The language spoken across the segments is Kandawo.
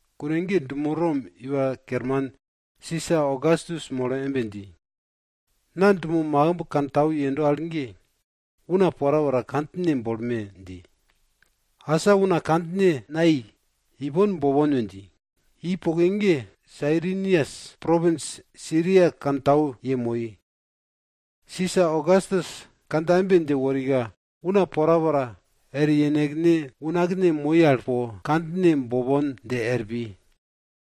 Kune ge dumo Rom iwa kerman Sisa Ogastus molo embe dji, na dumo makimb kantau yendo al ge, una porapora kandjine bolme! dji. Asa una kandjine buk al napai, ipon bopon we dji. Dji poke ge, Sairinias propins Siria kantau yemoi. Sisa Ogastus kandja embe dje worika, una porapora er yenekne unakne moi al po kandjine bopon dje er pi.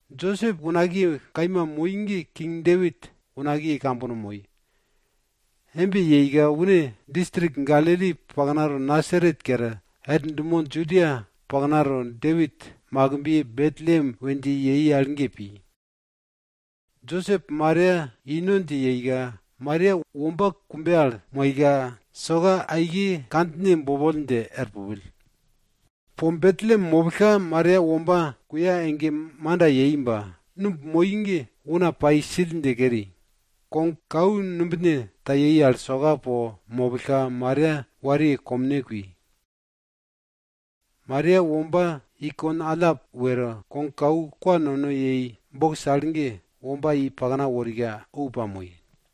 Josep unakiye kaima moi ge king Depit unakiye kambono moi. Embe pille une distrik Galili dumo Nasaret kere, er dumo Judia paknato Depit makimbiye Betlem we dji al ge pi. Josep Maria ino dje yeika, Maria womba kumbe al moika, soka kandjine bopoll dje er pupill. Po Betlem mopillka Maria womba kuya ege manda yei ba, numb moi ge una pai sill dje keri. Kogkau numbine ta yei al soka po mopillka, Maria wariye komne kui. Maria womba i kon allap were, kogkau kwa nono yei al bokis ge, womba i pakna worika ou pamoi.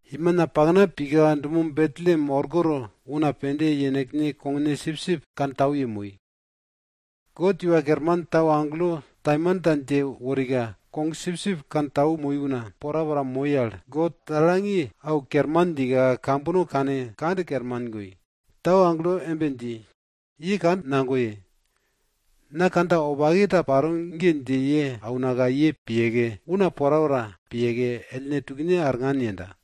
Imina pakna pika dumo Betlem orkoto, una pende yenekne kogne sipsip kantau yemoi. God Iwa Kerman tau agelo taimanta dje worika, kogsipsip kantau moi una porapora moi al, God poll dje au kerman djika, kambono kane kand kerman goi. Tau agelo embe dji, ye kand nagoye. Na kandja wopake ta paro ge, dje ye aunaka ye piyeke, una porapora piyeke, ellne tukne arngan yenda.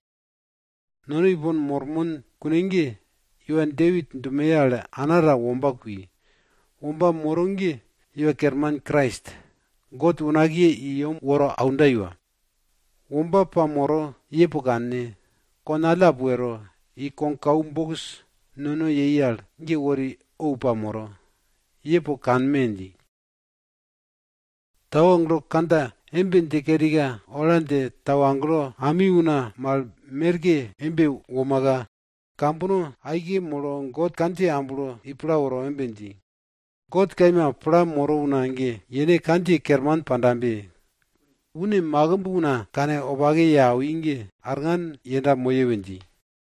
Nono ipon mormon kune ge, iwa Depit dumoye al ana ta womba kui. Womba moro ge Iwa Kerman Krais. God unakiye i yem woro aunda iwa. Womba pamoro, ye po kanne. Kon allap wero, i kogkau kwa nono yei al bokis ge wori ou pamoro. Ye po kanme! dji. Tau agelo kandja embe dje kerika, ola dje tau agelo ami una mal merke embe womaka, kambono aike molo God kandjiye amblo i pla woro embe dji, God kaima pla moro una ge, yene kandjiye kerman pandabe! Une makimb una kanwopake ye awi ge, arngan yenda moye we dji.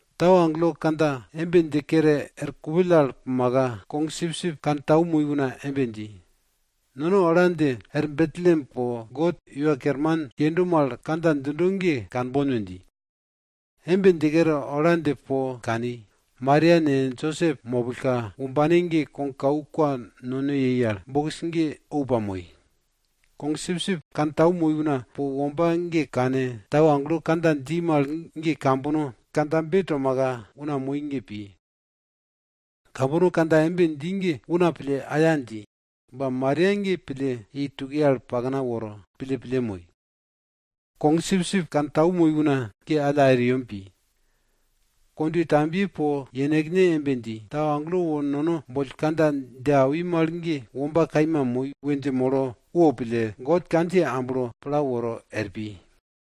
Tau agelo kandja embe dje kere er kupill al pumaka, kogsipsip kantau moi una embe dji, nono ola dje er Betlem po God Iwa Kerman yendo mal kandja djindo ge kanbon we dji. Embe dje kere, ola dje po kani. Maria ne, Josep mopillka, wombane ge kogkau kwa nono yei al bokis ge ou pamoi. Kog sipsip kantau moi una po womba ge kane, tau agelo kandja dji mal ge kambono kandjabe tomaka, una moi ge pi. Kambono kandja embe dji ge una pille, aya dji. Ba Maria ge pille, i tukiye al pakna woro pille pille moi. Kog sipsip kantau moi una ge alla er yem pi. Kondwe tambiye po yenekne embe dji, tau agelo wo nono boll kandja dje awi mal ge womba kaima moi we dje molo wo pille, God kandjiye amblo pla woro er pi.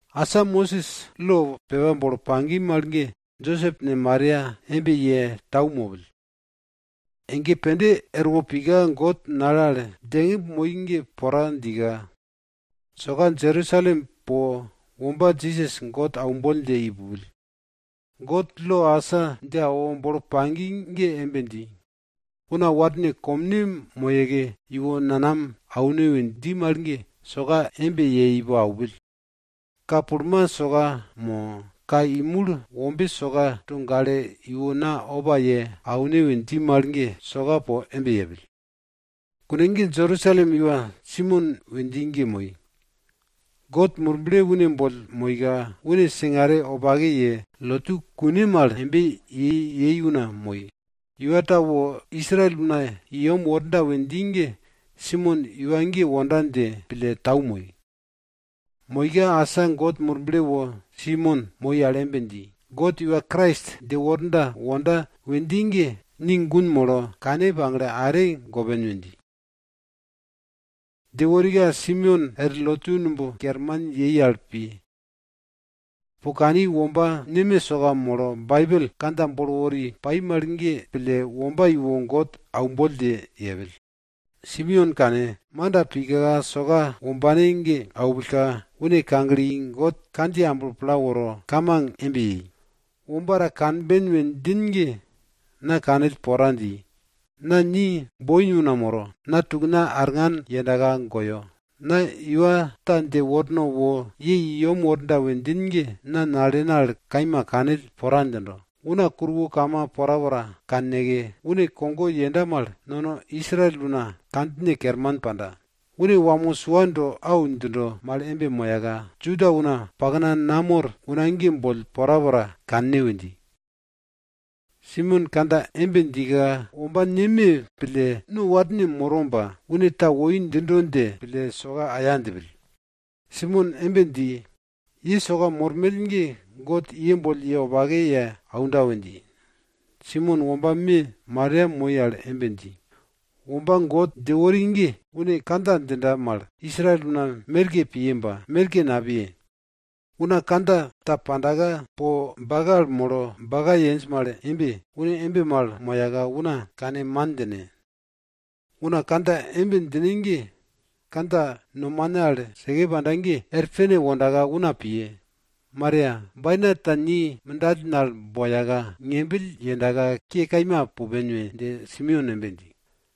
Asa Mosis lo pepa bolo pagi mal ge Josep ne, Maria embe ye tau mopill. Ege pende erwo pika God nale al djengimb moi ge pora djika, soka Jerusalem po womba Jisas God aumboll dje i pupill. God lo asa dje awo bolo pagi ge embe dji, una warne komne moyeke iwo nanam aune we dji mal ge, soka embe ye ipo aupill. Ka pulma soka mo, ka imul wombe soka to gale iwo na opa ye aune we dji mal ge, soka po embe yepill. Kune ge Jerusalem iwa Simeon we dji ge moi. God Murble une boll moika, une singare wopake ye, lotu kune pai mal embe ye ye yei una moi. Iwa ta wo Israel una i yem worda we dji ge Simeon iwa ge wonda dje pille tau moi. Moika asa God Murble wo Simeon moi al embe dji, God iwa Krais dje worda wonda we dji ge, ni gun molo, kane pagle are gopen we dji. Dje worika Simeon er lotu numb kerman yei al pi. Po kani womba neme soka molo Baibel kandja bolo wori pai mal ge pille, womba iwo God aumboll dje yepill. Simeon kane, manda pika soka wombane ge aupillka, une kagle i God kandjiye amblo pla woro kamang embe yei, womba ta kanben we djin ge, na kanill pora dji. Na ni nukogo una moro, ni yeworbenka na tukna arngan yendaka goyo. Na iwa ta dje wornaka wo ye i yem worda we djin ge, na nalena al kaima kanill pora djindo. Una kuruwo kama porapora kanneke, une kogo yenda mal, nono Israel una kandjine kerman panda. Une wamo sua do au djindo mal embe moyaka, Juda una pakna namor una ge boll porapora kanne we dji. Simeon kandja embe djika, womba neme pille, no warne moro ba, une ta woi djindo dje pille, soka aya djipill. Simeon embe dji, ye soka mormell ge God ye boll ye wopake ye aunda we dji. Simeon womba me Maria moi al embe dji, womba God dje wori ge, une kandja djinda mal Israel una merke piye ba, merke napiye. Una kandja ta pandaka, po bake al molo baka yenj mal embe, une embe mal moyaka una kane man djine. Una kandja embe djine ge kandja nomane al seke panda ge, er pene wondaka una piye. Maria, bainat ta ni mindalen al boyaka pupen we dje Simeon embe dji.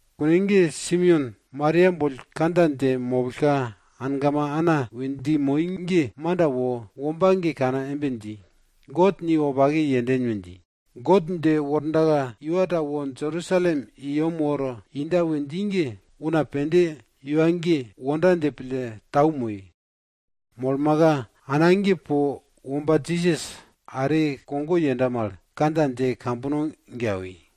Kune ge Simeon Maria boll kandja dje mopillka, angama Ana we dji moi ge manda wo, womba ge kane embe dji, God ni wopake yenden we dji. God dje wordaka iwa ta wo Jerusalem i yem woro inda we dji ge, una pende iwa ge wonda dje pille tau moi. Molmaka, ana ge po womba Jisas are kogo yenda mal, kandja dje kambono ge awi.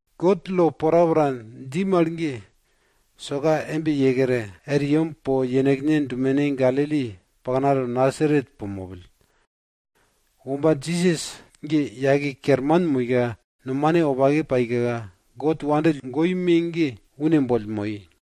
God lo porapora dji mal ge, soka embe ye kere, er yem po yenekne dumene Galili paknato Nasaret po mopill. Womba Jisas ge yake kerman moika, nomane wopake paika, God nono wopake pille awi me ge une boll pai.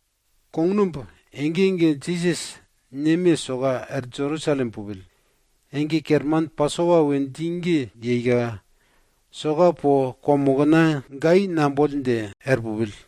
Kognumb ege ege Jisas neme soka er Jerusalem pupill. Ege kerman Pasopa we dji ge yeika, soka po kwamokna gai namboll dje er pupill.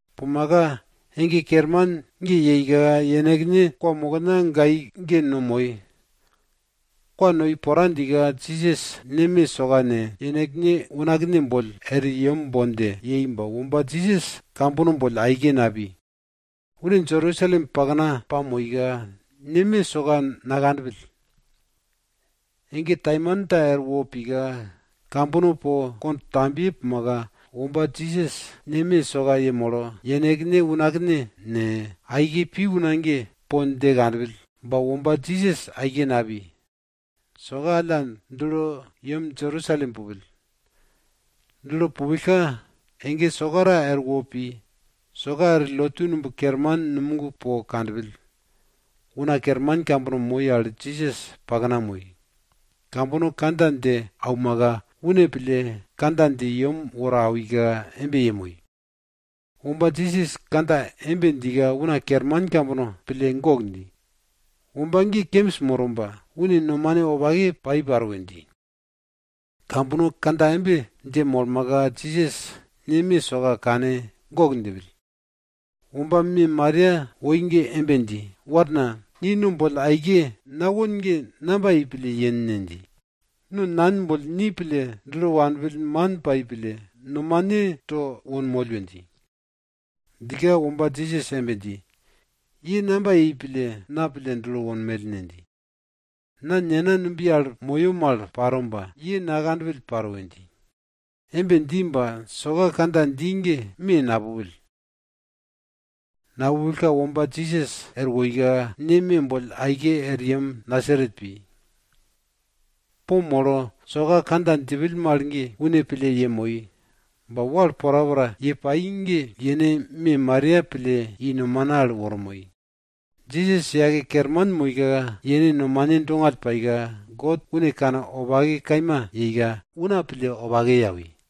Pumaka ege kerman ge yeika, yenekne kwamokna gai ge no moi. Kwa noi pora djika, Jisas neme soka ne, yenekne unakne boll er yem bon dje yei ba, womba Jisas kambono boll aike napi. Une Jerusalem pakna pamoika, neme soka nakanpill. Ege taimanta erwo pika, kambono po kondwe tambiye pumaka, womba Jisas neme soka yemolo, yenekne unakne ne, aike pi una ge po dje kanpill. Ba, womba Jisas aike napi. Soka alla dulo yem Jerusalem pupill. Dulo pupillka, ege sokara erwo pi. Soka er lotu numb kerman numog po kanpill, una kerman kambono moi al Jisas pakna moi. Kambono kandja dje aumaka, une pille kandja dje yem woro awika embe yemoi. Womba Jisas kandja embe djika una kerman kambono pille gok dji. Womba ge kembis moro ba, une nomane wopake pai paro we dji. Kambono kandja embe dje molmaka, Jisas neme soka kane gok djipill. Womba me Maria woi ge embe dji, warna, ni no boll aike nawon ge namba yei pille yen ne? dji. No nan boll ni pille dulo wanpill, man pai pille, nomane to wonmoll we dji. Djika womba Jisas embe dji, ye namba yei pille na pille dulo wonmell ne? dji. Na Nena numbiye al moyo mal paro ba, ye nakanpill paro we dji. Embe dji ba, soka kandja dji ge me napupill. Napupillka womba Jisas er woika, neme boll aike er yem Nasaret pi. Po molo, soka kandja djipill mal ge, une pille yemoi. Ba wal porapora ye pai ge yene me Maria pille i nomane al woro moi. Jisas yake kerman moika, yene nomane dongall paika, God une kanwopake kaima yeika, una para wopake kani.